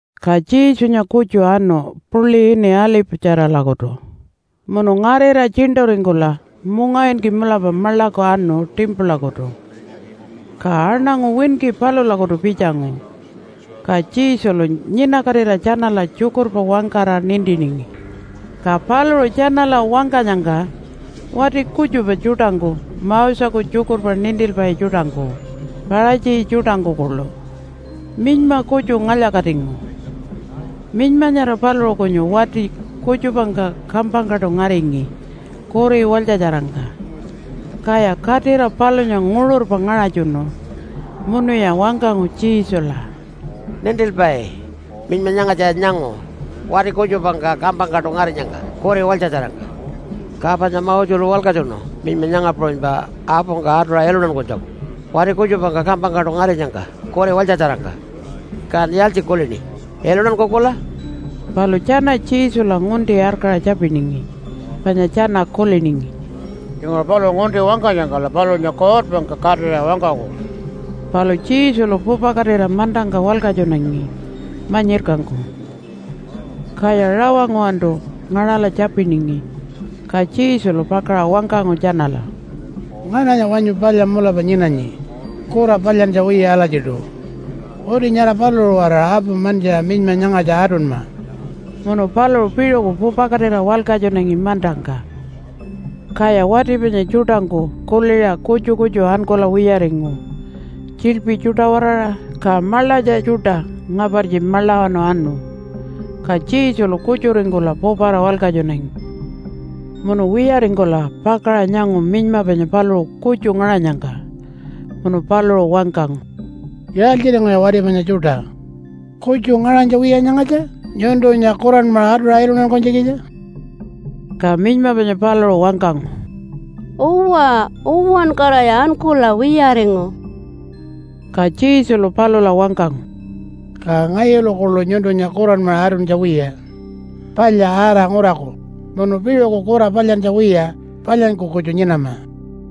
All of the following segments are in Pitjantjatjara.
Ka Jesunya kutju anu puḻi ini Alipatjaralakutu. Munu ngarira tjiṉṯuringkula mungawinki mulapa maḻaku anu timpulakutu. Ka aṉangu winki palulakutu pitjangu, ka Jesulu nyinakatira tjanala tjukurpa wangkara nintiningi. Ka paluṟu tjanala wangkanyangka wati kutjupa tjuṯangku Moseku tjukurpa nintilpai tjuṯangku, Paṟatji tjuṯangku kuḻu minyma kutju ngalya-katingu. Minyma nyara paluṟu kunyu wati kutjupangka kampangkaṯu ngaringi kuri walytjatjarangka. Kaya katira palunya nguṟurpa ngaṟatjunu. Munuya wangkangu Jesula, “Nintilpai, minyma nyangatjaya nyangu wati kutjupangka kampangkaṯu ngarinyangka kuri walytjatjarangka. Ka panya Moselu walkatjunu minyma nyanga puṟunypa apungka atuṟa iluntankunytjaku wati kutjupangka kampangkaṯu ngarinyangka kuri walytjatjarangka. Kan yaaltji kulini? Iluntankukula?” Palu tjana Jesula ngunti arkaṟa tjapiningi, panya tjana kuliningi, “Tjinguṟu paluṟu ngunti wangkanyangkala palunya kuutpangka katira wangkaku.” Palu Jesulu pupakatira mantangka walkatjunangi manyirkangku. Kaya rawa nguwantu ngaṟala tjapiningi, ka Jesulu pakaṟa wangkangu tjanala, “Ngananya wanyu palya mulapa nyinanyi kura palyantja wiya alatjiṯu? Uti nyara paluṟu-waraṟa apu mantjiṟa minyma nyangatja atunma.” Munu paluṟu piṟuku pupakatira walkatjunangi mantangka. Kaya wati panya tjuṯangku kuliṟa kutju kutju ankula wiyaringu tjiḻpi tjuṯa-waraṟa, ka maḻatja tjuṯa ngapartji maḻawanu anu. Ka Jesulu kutjuringkula pupara walkatjunangi. Munu wiyaringkula pakaṟa nyangu minyma panya paluṟu kutju ngaṟanyangka. Munu paluṟu wangkangu, “Yaaltjiringuya wati panya tjuṯa? Kutju ngaṟanytja wiya nyangatja nyuntunya kuranmaṟa atuṟa iluntankunytjikitja?” Ka minyma panya paluṟu wangkangu, “Uwa, uwankaraya ankula wiyaringu.” Ka Jesulu palula wangkangu, “Ka ngayulu kuḻu nyuntunya kuranmaṟa atuntja wiya. Palya ara nguraku, munu piṟuku kura palyantja wiya palyanyku kutju nyinama.”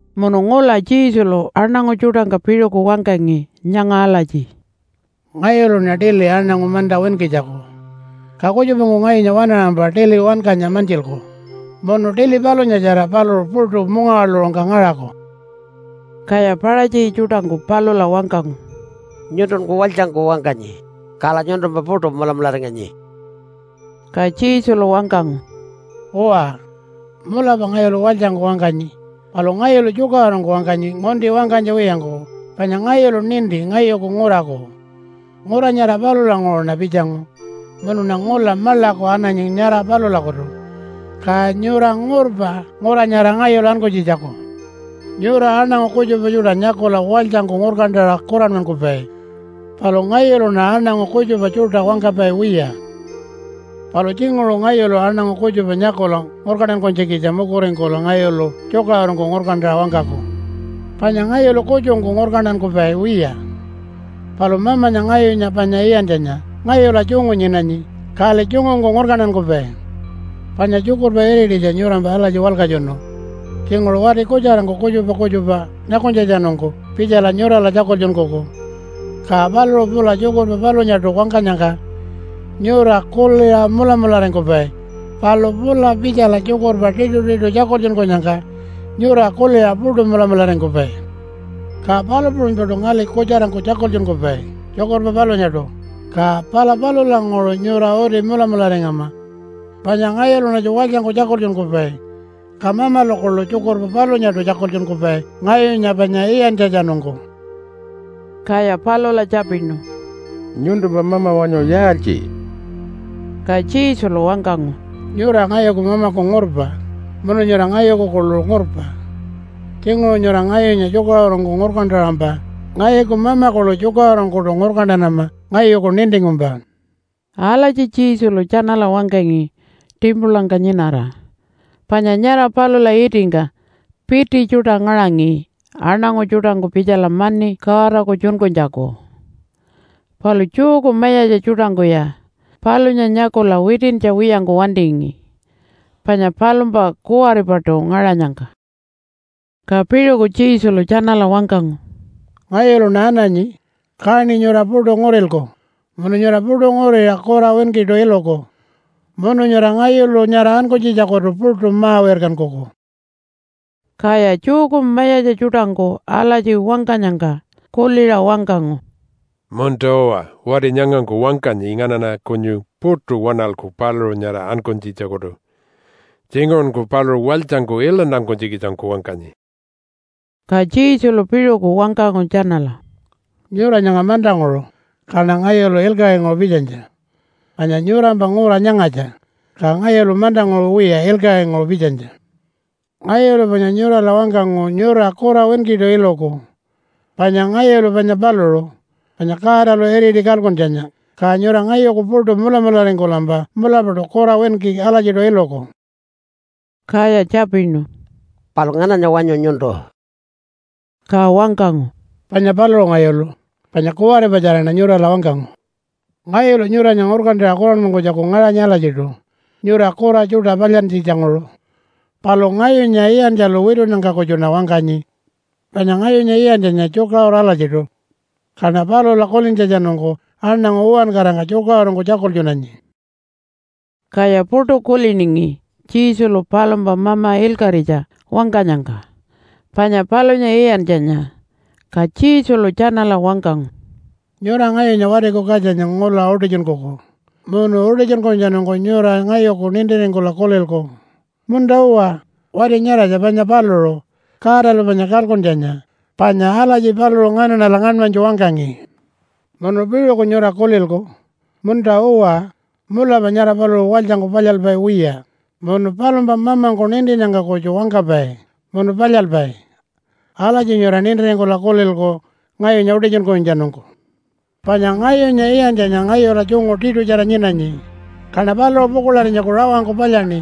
Munu ngula Jesulu aṉangu tjuṯangka piṟuku wangkangi nyanga alatji, “Ngayuluṉa tili aṉangu manta winkitjaku. Ka kutjupangku ngayunya waṉaṟampa tili wankanya mantjilku, munu tili palunyatjara paluṟu puṯu mungawaḻuṟungka ngaṟaku.” Kaya Paṟatji tjuṯangku palula wangkangu, “Nyuntunkun walytjangku wangkanyi, kala nyuntumpa puṯu mulamularinganyi.” Ka Jesulu wangkangu, “Uwa, mulapa ngayulu walytjangku wangkanyi, palu ngayulu tjukaṟurungku wangkanyi ngunti wangkanytja wiyangku, panya ngayulu ninti ngayuku nguraku. Ngura nyara palulanguṟuṉa pitjangu munuṉa ngula maḻaku ananyi nyara palulakutu. Ka nyura ngurpa ngura nyara ngayulu ankunytjitjaku. Nyura aṉangu kutjupa tjuṯa nyakula walytjangku ngurkantaṟa kuranmankupai. Palu ngayuluṉa aṉangu kutjupa tjuṯa wangkapai wiya. “Palu tjinguṟu ngayulu aṉangu kutjupa nyakula ngurkantankunytjikitja mukuringkula ngayulu tjukaṟurungku ngurkantaṟa wangkaku. Panya ngayulu kutjungku ngurkantankupai wiya. Palu Mamanya ngayunya panya iyantjanya ngayula tjungu nyinanyi kali tjungungku ngurkantankupai. Panya tjukurpa irititja nyurampa alatji walkatjunu, ‘Tjinguṟu wati kutjarangku kutjupa kutjupa nyakunytjatjanungku pitjala nyurala tjakultjunkuku, ka paluṟu pula tjukurpa palunyaṯu wangkanyangka nyura kuliṟa mulamularingkupai. Palu pula pitjala tjukurpa tiṯutiṯu tjakultjunkunyangka nyura kuliṟa puṯu mulamularingkupai.’ Ka palu puṟunypaṯu ngali kutjarangku tjakultjunkupai tjukurpa palunyaṯu, ka pala palulanguṟu nyura uti mulamularingama. Panya ngayuluṉatju walytjangku tjakultjunkupai, ka Mamalu kuḻu tjukurpa palunyaṯu tjakultjunkupai ngayunya panya iyantjatjanungku.” Kaya palula tjapinu, “Nyuntumpa mama wanyu yaaltji?” Ka Jesulu wangkangu, “Nyura ngayuku Mamaku ngurpa munu nyura ngayuku kuḻu ngurpa. Tjinguṟu nyura ngayunya tjukaṟurungku ngurkantaṟampa ngayuku Mama kuḻu tjukaṟurungkuṯu ngurkantanama ngayuku nintingkumpa.” Alatji Jesulu tjanala wangkangi timpulangka nyinara, panya nyara palula itingka piti tjuṯa ngaṟangi aṉangu tjuṯangku pitjala mani Godaku tjunkunytjaku. Palu Jewku mayatja tjuṯangkuya palunya nyakula witintja wiyangku wantingi, panya palumpa kuwaripaṯu ngaṟanyangka. Ka piṟuku Jesulu tjanala wangkangu, “Ngayuluṉa ananyi, kaṉi nyura puṯu ngurilku munu nyura puṯu nguriṟa kura winkiṯu iluku. Munu nyura ngayulu nyara ankunytjitjakutu puṯu ma-wirkankuku.” Kaya Jewku mayatja tjuṯangku alatji wangkanyangka kuliṟa wangkangu, “Munta-uwa, wati nyangangku wangkanyi nganaṉa kunyu puṯu waṉalku paluṟu nyara ankunytjitjakutu. Tjinguṟunku paluṟu walytjangku iluntankunytjikitjangku wangkanyi.” Ka Jesulu piṟuku wangkangu tjanala, “Nyura nyanga mantanguṟu, kaṉa ngayulu ilkaṟinguṟu pitjanytja. Panya nyurampa ngura nyangatja, ka ngayulu mantanguṟu wiya ilkaṟinguṟu pitjanytja. Ngayulu panya nyurala wangkangu nyura kura winkiṯu iluku. Panya ngayulu panya paluṟu, panya Godalu iriti kalkuntjanya, ka nyura ngayuku puṯu mulamularingkulampa mulapaṯu kura winki alatjiṯu iluku.” Kaya tjapinu, “Palu ngananya wanyu nyuntu?” Ka wangkangu, “Panya paluṟu ngayulu, panya kuwaripatjaraṉa nyurala wangkangu. Ngayulu nyuranya ngurkantaṟa kuranmankunytjaku ngaṟanyi alatjiṯu, nyura kura tjuṯa palyantjitjanguṟu. Palu ngayunya iyantjalu witunnyangka kutjuṉa wangkanyi. Panya ngayunya iyantjanya tjukaṟuru alatjiṯu. Kaṉa palula kulintjatjanungku aṉangu uwankarangka tjukaṟurungku tjakultjunanyi.” Kaya puṯu kuliningi Jesulu palumpa Mama ilkaṟitja wangkanyangka panya palunya iyantjanya. Ka Jesulu tjanala wangkangu, “Nyura ngayunya Watiku Katjanya ngula utitjunkuku munu utitjunkunytjatjanungku nyura ngayuku nintiringkula kulilku, ‘Munta-uwa, wati nyaratja panya paluṟu, Godalu panya kalkuntjanya, panya alatji paluṟu nganaṉala ngaṉmanytju wangkangi.’ Munu piṟuku nyura kulilku, ‘Munta-uwa, mulapa nyara paluṟu walytjangku palyalpai wiya, munu palumpa Mamangku nintinnyangka kutju wangkapai munu palyalpai.’ Alatji nyura nintiringkula kulilku ngayunya utitjunkunytjatjanungku. Panya ngayunya iyantjanya ngayula tjungu tiṯutjara nyinanyi, kaṉa paluṟu pukuḻarinytjaku rawangku palyaṉi,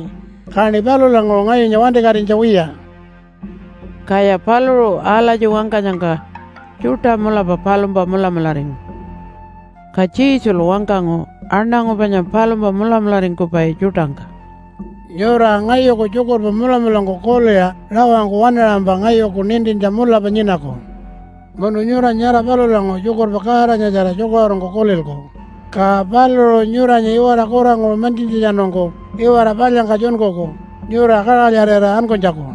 kaṉi palulanguṟu ngayunya wantikatinytja wiya.” Kaya paluṟu alatji wangkanyangka tjuṯa mulapa palumpa mulamularingu. Ka Jesulu wangkangu aṉangu panya palumpa mulamularingkupai tjuṯangka, “Nyura ngayuku tjukurpa mulamulangku kuliṟa rawangku waṉaṟampa ngayuku nintintja mulapa nyinaku. Munu nyura nyara palulanguṟu tjukurpa Godanyatjara tjukaṟurungku kulilku, ka paluṟu nyuranya iwara kuranguṟu mantjintjatjanungku iwara palyangka tjunkuku nyura kaṟalyarira ankunytjaku.”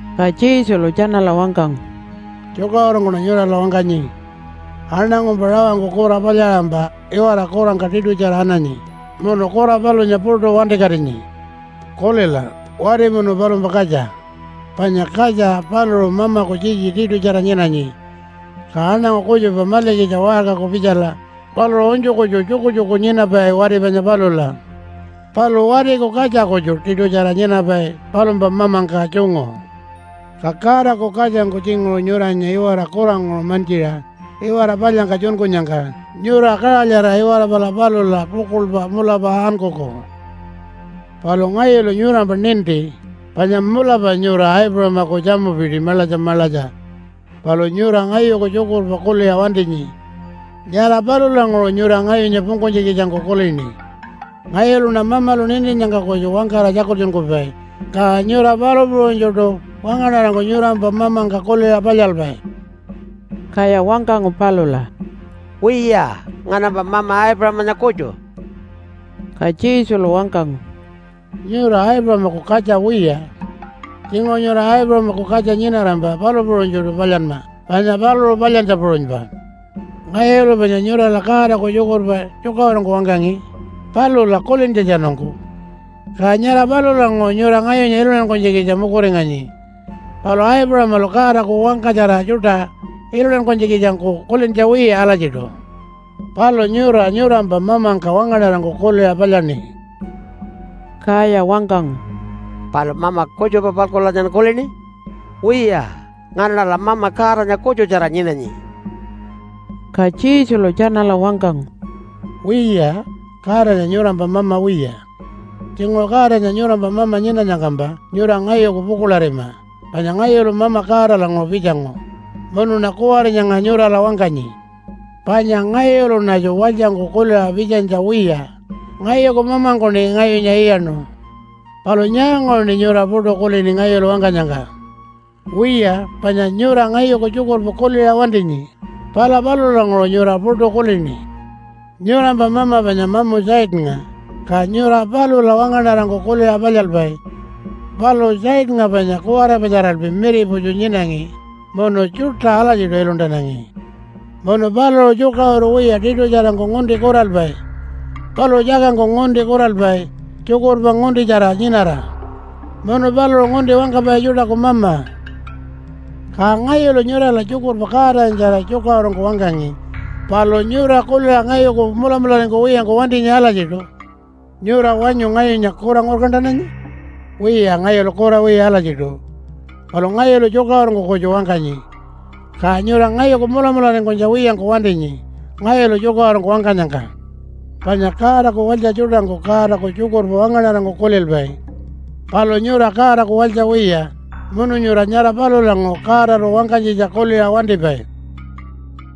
Ka Jesulu tjanala wangkangu, “Tjukaṟurungkuṉa nyurala wangkanyi. Aṉangungkumpa rawangku kura palyaṟampa iwara kurangka tiṯutjara ananyi munu kura palunya puṯu wantikatinyi. Kulila wati munu palumpa katja. Panya katja paluṟu mamaku tjitji tiṯutjara nyinanyi. Ka aṉangu kutjupa malikitja waṟkaku pitjala, paluṟu unytju kutju tjukutjuku nyinapai wati panya palula. Palu watiku katja kutju tiṯutjara nyinapai palumpa mamangka tjungu. Ka Godaku katjangku tjinguṟu nyuranya iwara kuranguṟu mantjiṟa iwara palyangka tjunkunyangka nyura kaṟalyarira iwara pala palula pukuḻpa mulapa ankuku. “Palu ngayulu nyurampa ninti panya mulapa nyura Aipuṟamaku tjamupiti maḻatja maḻatja. Palu nyura ngayuku tjukurpa kuliṟa wantinyi. Nyara palulanguṟu nyura ngayunya pungkunytjikitjangku kulini. Ngayuluṉa Mamalu nintinnyangka kutju wangkara tjakultjunkupai, ka nyura palu puṟunytjuṯu wangaṉarangku nyurampa mamangka kuliṟa palyalpai.” Kaya wangkangu palula, “Wiya, nganampa mama Aipuṟamanya kutju.” Ka Jesulu wangkangu, “Nyura Aipuṟamaku katja wiya. Tjinguṟu nyura Aipuṟamaku katja nyinarampa palu puṟunytjuṯu palyanma panya paluṟu palyantja puṟunypa. Ngayulu panya nyurala Godaku tjukurpa tjukaṟurungku wangkangi palula kulintjatjanungku. Ka nyara palulanguṟu nyura ngayunya iluntankunytjikitja mukuringanyi. Palu Aipuṟamalu Godaku wangkatjara tjuṯa iluntankunytjikitjangku kulintja wiya alatjiṯu. Palu nyura nyurampa mamangka wangaṉarangku kuliṟa palyaṉi.” Kaya wangkangu, “Palu mama kutjupa-palkulanyan kulini? Wiya, nganaṉala mama Godanya kutjutjara nyinanyi.” Ka Jesulu tjanala wangkangu, “Wiya, Godanya nyurampa mama wiya. Tjinguṟu Godanya nyurampa mama nyinanyangkampa nyura ngayuku pukuḻarima, panya ngayulu Mama Godalanguṟu pitjangu, munuṉa kuwari nyanga nyurala wangkanyi. Panya ngayuluṉatju walytjangku kuliṟa pitjanytja wiya, ngayuku mamangkuṉi ngayunya iyaṉu. Palu nyaanguṟuṉi nyura puṯu kulini ngayulu wangkanyangka? Wiya, panya nyura ngayuku tjukurpa kuliṟa wantinyi, pala palulanguṟu nyura puṯu kulini. Nyurampa mama panya mamu Satannga, ka nyura palula wangaṉarangku kuliṟa palyalpai. Palu Satannga panya kuwaripatjaralpi miriputju nyinangi munu tjuṯa alatjiṯu iluntanangi. Munu paluṟu tjukaṟuru wiya tiṯutjarangku ngunti kuralpai. Paluṟu tjakangku ngunti kuralpai tjukurpa nguntitjara nyinara. Munu paluṟu ngunti wangkapai tjuṯaku mama. “Ka ngayulu nyurala tjukurpa Godanyatjara tjukaṟurungku wangkangi, palu nyura kuliṟa ngayuku mulamularingkuwiyangku wantinyi alatjiṯu. Nyura wanyu ngayunya kura ngurkantananyi? Wiya, ngayulu kura wiya alatjiṯu. Palu ngayulu tjukaṟurungku kutju wangkanyi. Ka nyura ngayuku mulamularingkunytja wiyangku wantinyi ngayulu tjukaṟurungku wangkanyangka. Panya Godaku walytja tjuṯangku Godaku tjukurpa wangaṉarangku kulilpai. Palu nyura Godaku walytja wiya, munu nyura nyara palulanguṟu Godalu wangkanytjitja kuliṟa wantipai.”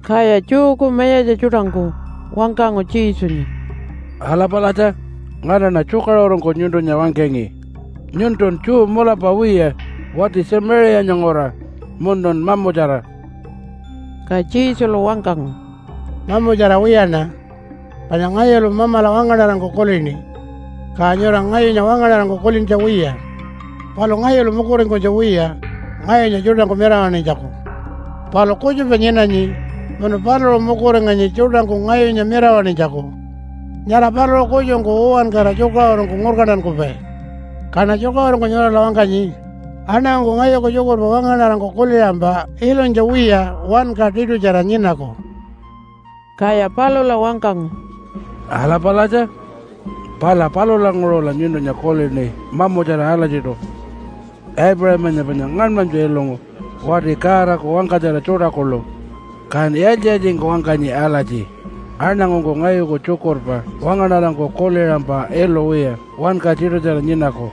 Kaya Jewku mayatja tjuṯangku wangkangu Jesunya, “Ala palatja, nganaṉa tjukaṟurungku nyuntunya wangkangi. Nyuntun Jew mulapa wiya wati Tjamiṟiyanya nguraṟa munun mamutjara.” Ka Jesulu wangkangu, “Mamutjara wiyaṉa. Panya ngayulu Mamala wangaṉarangku kulini. Ka nyura ngayunya wangaṉarangku kulintja wiya. Palu ngayulu mukuringkunytja wiya ngayunya tjuṯangku mirawaṉinytjaku. Palu kutjupa nyinanyi munu paluṟu mukuringanyi tjuṯangku ngayunya mirawaṉinytjaku. Nyara paluṟu kutjungku uwankara tjukaṟurungku ngurkantankupai. Kaṉa tjukaṟurungku nyurala wangkanyi, ‘Aṉangungku ngayuku tjukurpa wangaṉarangku kuliṟampa ilunytja wiya wanka tiṯutjara nyinaku.’” Kaya palula wangkangu, “Ala palatja, pala palulanguṟula nyuntunya kulini mamutjara alatjiṯu. Aipuṟamanya panya ngaṉmanypa ilungu, wati Godaku wangkatjara tjuṯa kuḻu. Kan yaaltji-yaaltjingku wangkanyi alatji, ‘Aṉangungku ngayuku tjukurpa wangaṉarangku kuliṟampa ilu wiya wanka tiṯutjara nyinaku.’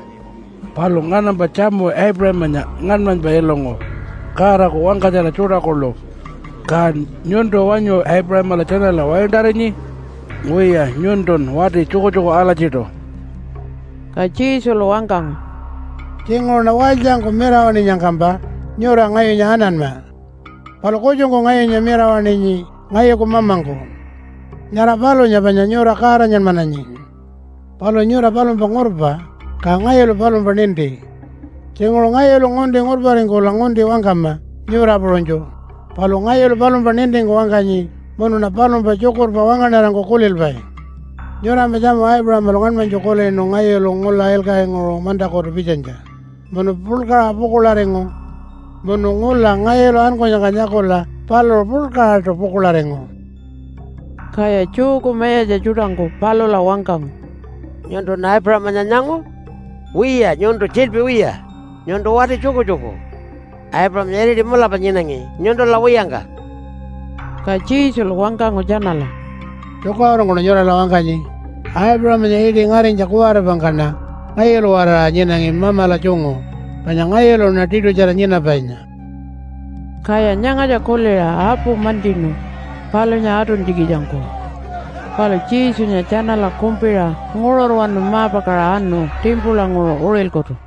Palu nganampa tjamu Aipuṟamanya ngaṉmanypa ilungu Godaku wangkatjara tjuṯa kuḻu, kan nyuntu wanyu Aipuṟamala tjanala waintarinyi? Wiya, nyuntun wati tjukutjuku alatjiṯu.” Ka Jesulu wangkangu, “Tjinguṟuṉa walytjangku mirawaṉinyangkampa nyura ngayunya ananma. Palu kutjungku ngayunya mirawaṉinyi ngayuku Mamangku. Nyara palunya panya nyura Godanyanmananyi. Palu nyura palumpa ngurpa, ka ngayulu palumpa ninti. Tjinguṟu ngayulu ngunti ngurparingkula ngunti wangkama nyura puṟunytju, palu ngayulu palumpa nintingku wangkanyi munuṉa palumpa tjukurpa wangaṉarangku kulilpai. Nyurampa tjamu Aipuṟamalu ngaṉmanytju kulinu ngayulu ngula ilkaṟinguṟu mantakutu pitjanytja, munu puḻkaṟa pukuḻaringu. Munu ngula ngayulu ankunyangka nyakula paluṟu puḻkaṟaṯu pukuḻaringu.” Kaya Jewku mayatja tjuṯangku palula wangkangu, “Nyuntun Aipuṟamanya nyangu? Wiya nyuntun tjiḻpi wiya, nyuntu wati tjukutjuku. Aipuṟamanya iriti mulapa nyinangi nyuntula wiyangka.” Ka Jesulu wangkangu tjanala, “Tjukaṟurungkuṉa nyurala wangkanyi, Aipuṟamanya iṯi ngarinytja kuwaripangkaṉa ngayulu-waraṟa nyinangi Mamala tjungu, panya ngayuluṉa Tiṯutjara Nyinapainya.” Kaya nyangatja kuliṟa apu mantjinu palunya atuntjikitjangku. Palu Jesunya tjanala kumpiṟa nguṟurwanu ma-pakaṟa anu timpulanguṟu uṟilkutu.